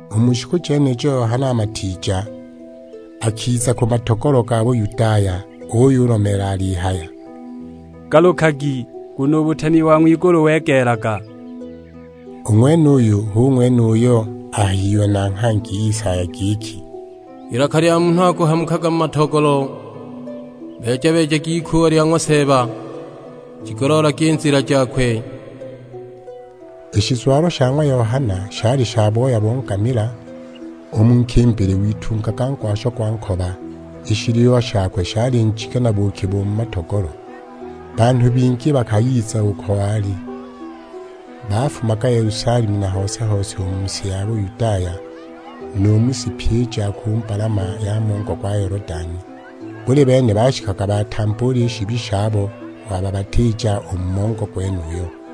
U mu shiku jenijo Yohana Matiija akiza ku matogolo ga Buyudaya; uyulomeela alihaya, "Galukagi, nguno u butemi bo ng'wigulu wegeelaga." U ng'wenuyo hu ng'wene uyo ahayiwe na nghangi Isaya, giki, "Ilaka lya munhu akuhamukaga mu matogolo, 'Beeja-beejagi ikuuwa lya ng'wa Seeba, jigoloolagi i nzila jakwe.' " I shizwalo sha ng'wa Yohana shali sha booya bo ngamila, u mu nkimbili witungaga ngwasho gwa nkoba, i shiliwa shakwe shali njige na buuki bo mu matogolo. Banhu bingi bakayiza uko wali; bafumaga Yelusalemu na hose-hose u mu si ya Buyudaya, nu mu si pyi i ja ku mbalama ya mongo gwa Yolodani. Buli bene bashikaga batambuula i shibi shabo wababatiija u mu mongo gwenuyo.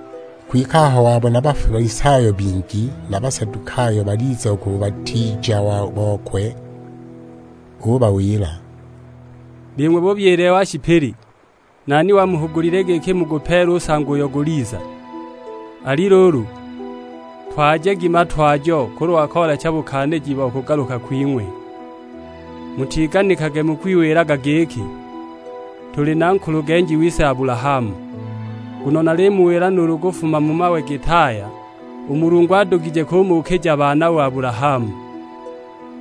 Kwike aho wabona Bafalisayo bingi na Basadukayo baliza u ku bubatiija bokwe; ubawila, "Bing'we bubyile wa shipili, nani wamuhugulile giki mugupeele u nsango uyo guliza? Ali luulu, twajagi matwajo kulwa koolecha bukaaniji bo kugaluka kwing'we. Mutiganikage mukwiwilaga giki, 'Tuli na nkulugenji wise Abulahamu.' Nguno nalimuwila nuulu kufuma mu mawe git'aya, u Mulungu adugije kumuukija baana u Abulahamu.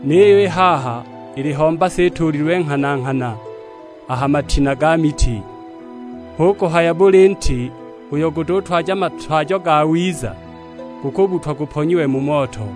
Niyo i haha iliho mbasa ituulilwe nghana-nghana a ha matina ga miti. Hu kuhaya buli nti uyo gututwaja matwajo gawiza, gukubbutwa guponyiwe mu moto.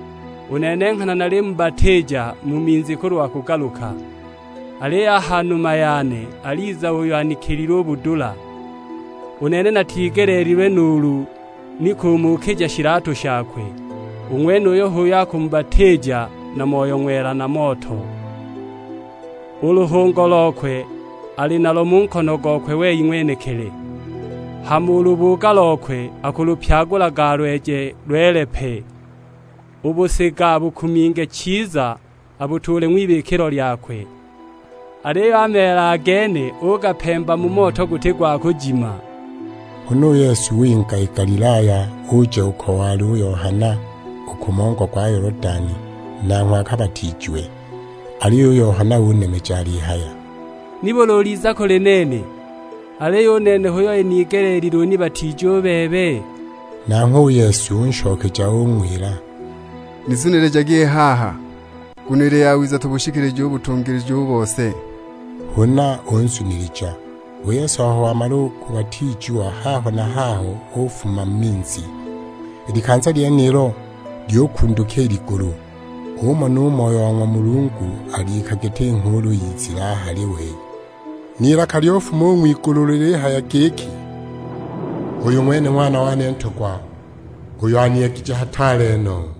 "U nene nghana nalimubatiija mu minzi kulwa kugaluka; aliyo a ha numa yane aliza uyo anikilile u budula. U nene natigeleelilwe nuulu ni kumuukija shilatu shakwe, u ng'wenuyo h'uyo akumubatiija na Moyo Ng'wela, na moto. U luhungo lokwe ali nalo mu nkono gokwe wei ng'wenekili, hama u lubuuga lokwe akulupyagula alweje lwele pe. U busiga abukuminge chiza abutuule ng'wibikilo lyakwe; aliyo a meela a gene ugapemba mu moto guti gwa kujima!" Huna u Yesu winga i Galilaya, uja uko wali u Yohana, u ku mongo gwa Yolodani, nanghwe akabatiijiwe. Aliyo u Yohana unemeja alihaya, "Nibuli uliza kuli nene, aliyo u nene hu inigeleelile unibatiije u bebe?" Nanghwe u Yesu unshokeja ung'wila, "Nizunilijage i haha, nguno ili yawiza tubushikilije u butungilija u bose." Huna unzunilija. U Yesu aho wamala u kubatiijiwa, haho na haho ufuma u mu minzi. I likanza lyenilo lyukunduka i ligulu, umona u Moyo wa ng'wa Mulungu alika giti nghuulu, izile a hali we. N'ilaka lyufuma u ng'wigulu lilihaya giki, "Uyu ng'wene Ng'wana wane Ntogwa, uyo aniyegije hataale no!"